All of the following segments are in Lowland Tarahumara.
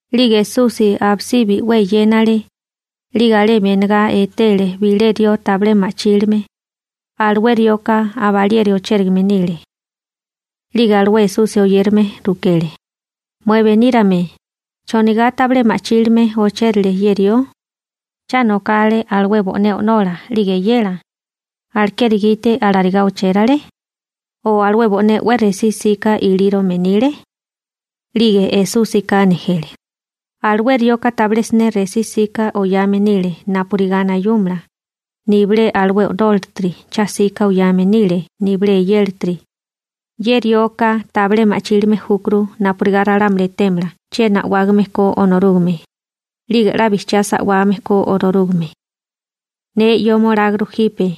'Lige Esusi abisibi 'we eyénale, 'lige alemi enegá etele bilé rió tabilé ma'chílime, alué rioka aba alieri ochérigame nile. 'Lige alué Esusi oyérame rukele: ―Mué benírame, ¿chonigá tabilé ma'chílime ochérile ye rió? ¿Cha nokale alué bo'né o'nola 'lige eyela, alekeri gite alarigá ochérale? O ¿alué bo'né 'we resí 'sika ilírome nile? 'Lige Esúsika nejele: ―Alué rioka tabilé siné resí 'sika oyame nile napurigá nayúmala, nibilé alué o'nólatiri cha 'sika oyame nile nibilé eyélatiri. Ye rioka tabilé ma'chílime júkuru napurigá ralámuli etémala chiena a'wágame ko Onorúgame, 'lige 'la bijchiá sa'wame ko Onorúgame. Neka 'yóma olágurú jipe.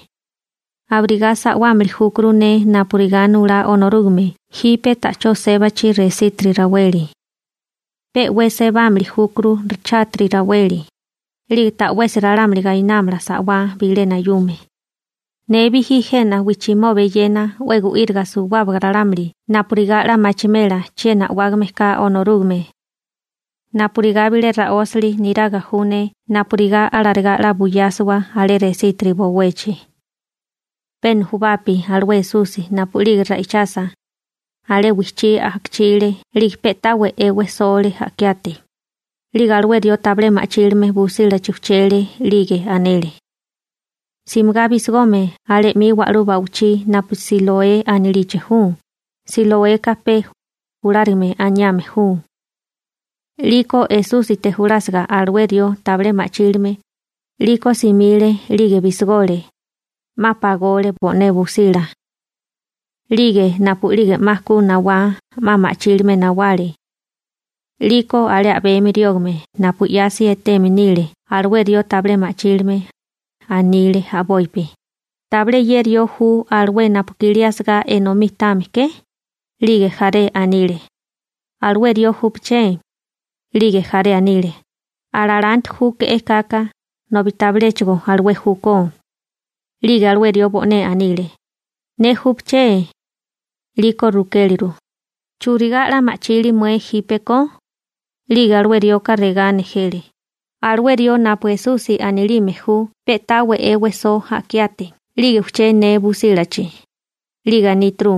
Abirigá sa'wámili júkuru ne napurigá nulá Onorúgame jipe ta'chó sébachi resítiri raweli. Pe 'we sebámili júkuru chátiri raweli, 'lige ta'wesi ralámuli gainámala sa'wá bilé nayume. Ne bijí jena wijchimoba eyena 'we gu'íriga suwábaga ralámuli napurigá 'la machimela chiena a'wágame ka Onorúgame. Napurigá bilé ra'ósali niraga ju ne napurigá alarigá 'la buyásiwa alé resítiri bowechi. Pe nujubapi alué Esusi napu'lige ra'ichasa, alé wijchí a'kichile 'lige pe'tá we'é wejsole a'kiate, 'lige alué rió tabilé ma'chílime busílachi ujchele. 'Lige anele: ―Simigá bisigome alé 'mi wa'lú ba'wichí napu Siloé anilichi ju. Siloeka pe, «julárigame» aniame ju. 'Liko Esúsite julásiga alué rió tabilé ma'chílime, 'liko simile 'lige bisigole, 'ma pagole bo'né busila, 'lige napu'lige 'ma ku nawá 'ma ma'chílime nawale. 'Liko alé a'bemi riógame napu 'yasi eteme nile alué rió tabilé ma'chílime, anile a'bopi: ―¿Tabilé ye rió ju alué napu i'kilí asagá enomí táame ke? 'Lige jaré anile: ―Alué rió júpeché. 'Lige jaré anile: ―A lalanti júke'é kaka, nobi tabiléchigo alué júkó. 'Lige alué rió bo'né anile: ―Ne júpeché. 'Liko rukéleru: ―¿Churigá 'la ma'chili mué jípeko? 'Lige alué rioka regá nejele: ―Alué rió napu Esusi anilime ju pe'tá we'é wejsó a'kiate 'lige ujché ne busílachi, 'lige aníturu: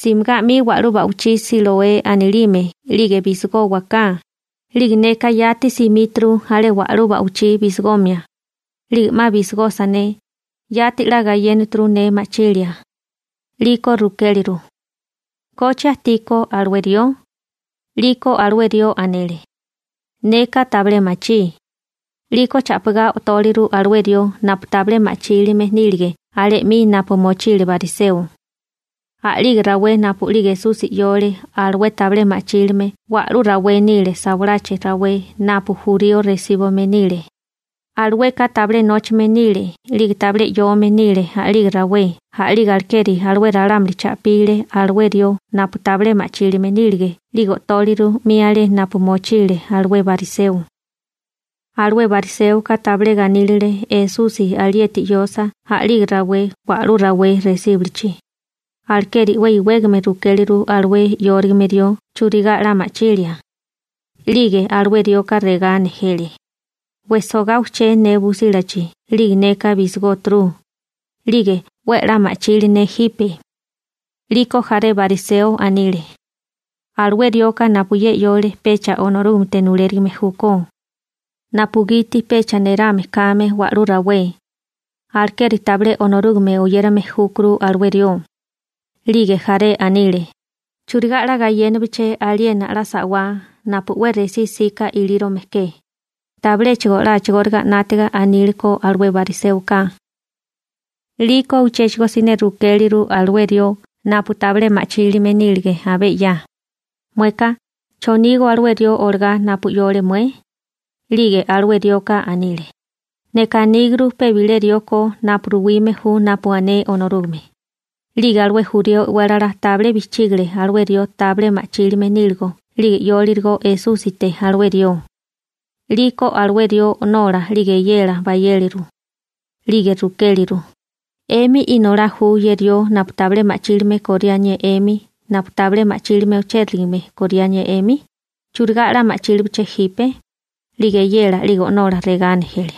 «Simigá 'mi wa'lú ba'wichí Siloé anilime 'lige bisigówaká.» 'Lige neka yati simíturu alé wa'lú ba'wichí bisigomia. 'Lige 'ma bisigosa ne, yati 'la gayénaturu ne ma'chilia. 'Liko rukéleru: ―¿Koche ajtiko alué rió? 'Liko alué rió anele: ―Neka tabilé machí. 'Liko cha'pigá o'tóleru alué rió napu tabilé ma'chílime nílige alé 'mi napu mochile bariseo. A'lige rawé napu'lige Esusi 'yole alué tabilé ma'chílime wa'lú rawé nile sawalachi rawé napu jurío resíbume nile, alueka tabilé nóchame nile 'lige tabilé 'yome nile a'lige rawé. A'lige alekeri alué ralámuli cha'pile alué rió napu tabilé ma'chílime nílige 'lige o'tóleru 'mi alé napu mochile alué bariseo. Alué bariséoka tabilé ganílile Esusi alieti 'yosa a'lige rawé wa'lú rawé resíbulichi, alekeri 'we iwégame rukéleru alué 'yórigame rió churigá 'la ma'chilia. 'Lige alué rioka regá nejele: ―Wejsogá ujché ne busílachi 'lige neka bisigóturu, 'lige 'we a'lá ma'chili ne jipe. 'Liko jaré bariseo anile: ―Alué rioka napu ye 'yole pecha Onorúgamete nulérigime júkó, napugiti pecha nerame kame wa'lú rawé. Alekeri tabilé Onorúgame oyérame júkuru alué rió. 'Lige jaré anile: ―¿Churigá 'la gayénabeché aliena 'la sa'wá napu 'we resí 'sika ilírome ke? Tabiléchigo 'la a'chigóriga 'nátiga aníleko alué bariséoka. 'Liko uchéchigo siné rukéleru alué rió napu tabilé ma'chílime nílige abé 'ya: ―Mueka, ¿chonígó alué rió olagá napu 'yole mué? 'Lige alué rioka anile: ―Neka aníguru pe bilé rió ko napu ruwime ju napu ané Onorúgame. 'Lige alué jurío e'wélala tabilé bijchígale alué rió tabilé ma'chílime níligo 'lige 'yólirigo Esúsite alué rió. 'Liko alué rió o'nola 'lige eyela bayéleru. 'Lige rukéleru: ―¿'Emi inolá ju ye rió napu tabilé ma'chílime koriánié 'emi, napu tabilé ma'chílime ochérigame koriánié 'emi? ¿Churigá 'la ma'chílibeché jipe? 'Lige eyela 'lige o'nola regá nejele: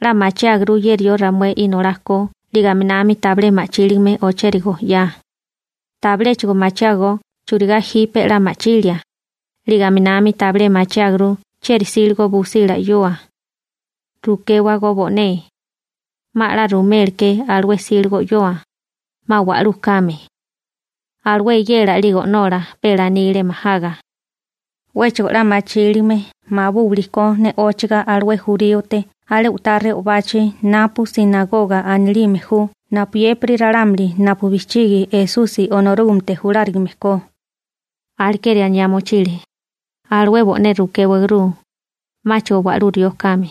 ―'La machiáguru ye rió ramué inolá ko 'lige aminami tabilé ma'chílime ochérigo 'ya. Tabiléchigo machiágó churigá jipe 'la ma'chilia, 'lige aminami tabilé machiáguru chieri 'síligo busila 'yoa. Rukéwagó bo'né, 'ma 'la ruméleké alué 'síligo 'yoa, 'ma wa'lú kame. Alué eyela 'lige o'nola pe lanile majaga. 'Wéchigo 'la machíligame mabúwilikó ne'óchiga alué juríote alé u'tá re'obachi napu «sinagoga» anilime ju napuyépiri ralámuli napu bijchigi Esusi Onorúgamete julárigame ko. Alekeri aniá mochile: «Alué bo'né rukéwaguru, 'máchigo wa'lú rió kame.»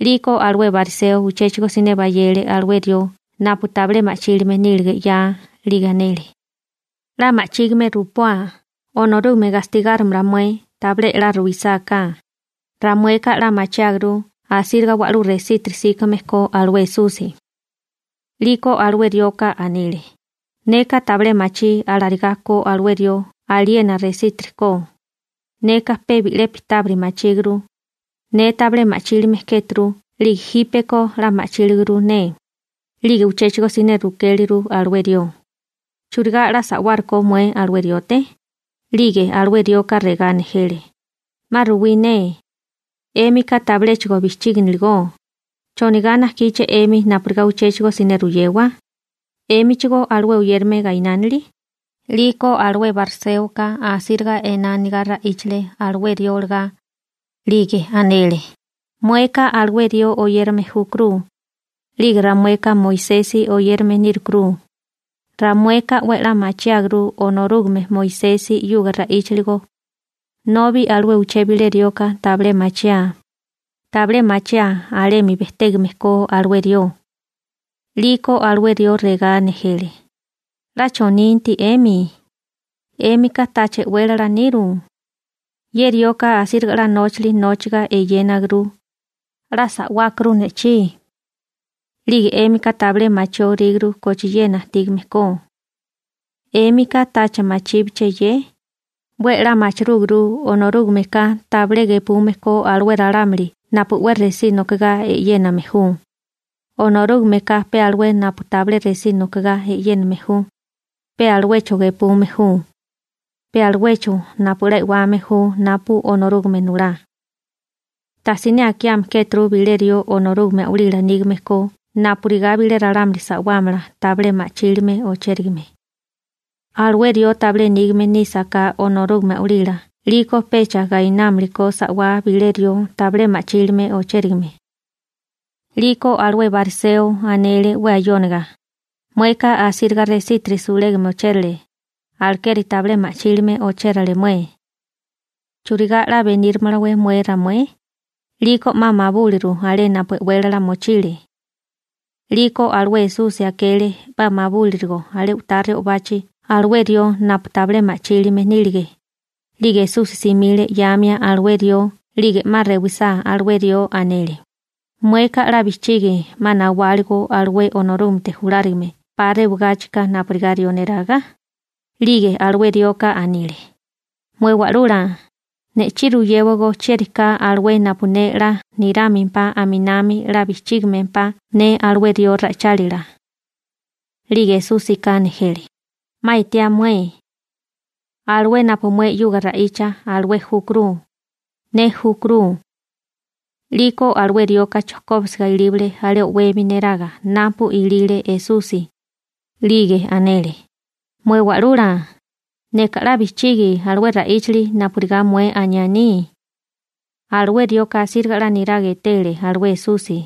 'Liko alué bariseo uchéchigo siné bayele alué rió napu tabilé ma'chílime nílige 'ya, 'lige anele: ―'La ma'chígime rupoa, Onorúgame gastigárimala mué tabilé 'la ruisáká, ramueka 'la machiáguru asíriga wa'lú resítiri 'síkame ko alué Esusi. 'Liko alué rioka anile: ―Neka tabilé machí alarigá ko alué rió aliena resítiri ko. Neka pe bi'lepi tábiri machíguru, ne tabilé ma'chílime kéturu 'lige jípeko 'la ma'chíliguru ne. 'Lige uchéchigo siné rukéleru alué rió: ―¿Churigá 'la sa'wárukó mué alué riote? 'Lige alué rioka regá nejele: ―'Ma ruwí ne, 'émika tabiléchigo bijchíginiligó. ¿Chonigá najkíché 'emi napurigá uchéchigo siné ruyewa? ¿'Émichigó alué oyérame gainánili? 'Liko alué bariséoka asíriga ená anigá ra'íchale alué rió olagá. 'Lige anele: ―Mueka alué rió oyérame júkuru, 'lige ramueka Moisesi oyérame nírukuru. Ramueka 'we a'lá machiáguru Onorúgame Moisesi 'yuga ra'íchiligo, nobi alué uché bilé rioka tabilé machiaa. Tabilé machiaa alemi bejtégame ko alué rió. 'Liko alué rió regá nejele: ―¿'La choninti 'emi? ¿'Émika tacha e'wélala niru? Ye rioka asíriga 'la nóchali nóchiga eyénaguru, 'la sa'wákuru ne'chí. 'Lige 'émika tabilé machióríguru kochiena ajtígame ko. ¿'Émika tacha machíbeché ye? 'We a'lá machirúguru Onorúgameka tabilé gepume ko alué ralámuli napu 'we resí nokigá e'yéname ju, Onorúgameka pe alué napu tabilé resí nokigá e'yéname ju, pe aluecho gepume ju, pe aluecho napu 'la e'wame ju napu Onorúgame nulá. Tajsiné akiame kéturu bilé rió Onorúgame a'walila nígame ko napurigá bilé ralámuli sa'wámala tabilé ma'chílime ochérigame. Alué rió tabilé nígame nísaká Onorúgame a'walila 'liko pecha gainámalakó sa'wá bilé rió tabilé ma'chílime ochérigame. 'Liko alué bariseo anele 'we ayóniga: ―Mueka, asíriga resítiri sulega ochérale, alekeri tabilé ma'chílime ochérale mué. ¿Churigá 'la benírumalawé mué ramué? 'Liko 'ma mabúliru alé napu e'wélala mochile. 'Liko alué Esusi akele 'ma mabúlirigo alé u'tá re'obachi alué rió napu tabilé ma'chílime nílige, 'lige Esusi simile 'yamia alué rió 'lige 'ma rewisá alué rió, anele: ―¿Mueka 'la bijchigi 'ma nawáligo alué Onorúgamete julárigame 'pa rewagáchika napurigá rió niraga? 'Lige alué rioka anile: ―Mué Wa'lula, ne'chí ruyéwagó chieri ka alué napurigá ne 'la nirámempá aminami 'la bijchígimempá ne alué rió ra'ichálila. 'Lige Esúsika nejele: ―'Ma etiá mué. Alué napu mué 'yuga ra'icha, alué júkuru. Ne júkuru. 'Liko alué rioka chojkóbisiga ilíbale alé o'wemi niraga napu ilile Esusi, 'lige anele: ―Mué Wa'lula, neka 'la bijchigi alué ra'íchali napurigá mué aniá aní. Alué rioka asíriga 'la niraga etele alué Esusi.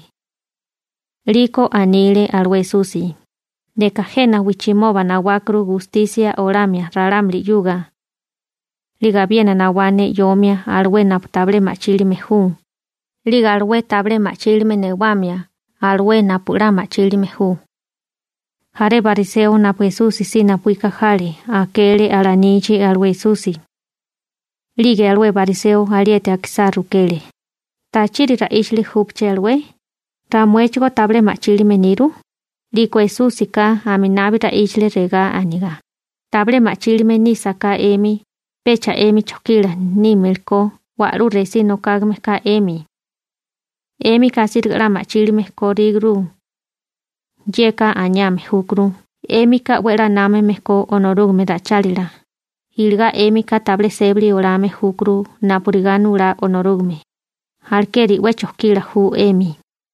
'Liko anile alué Esusi: ―Neka jena wijchimoba nawákuru gustisia olamia ralámuli. 'Lige abiena nawá ne 'yomia alué napu tabilé ma'chílime ju, 'lige alué tabilé ma'chílime newamia alué napu 'la ma'chílime ju. Jaré bariseo napu Esusi si napuíka jale akele alanichi alué Esusi. 'Lige alué bariseo alieti akisá rukele: ―¿Tachiri ra'íchali júpeché alué? ¿Ramuéchigó tabilé ma'chílime niru? 'Liko Esúsika aminabi ra'íchale regá anigá: ―Tabilé ma'chílime nísaká 'emi, pecha 'emi chojkila nímelikó wa'lú resí nokágame ka 'emi. 'Émika asíriga 'la ma'chílime kóríguru. Yeka aniame júkuru 'émika 'we a'lá námame ko Onorúgame ra'ichálila, iligá 'émika tabilé sébali olame júkuru napurigá nulá Onorúgame, alekeri 'we chojkila ju 'emi.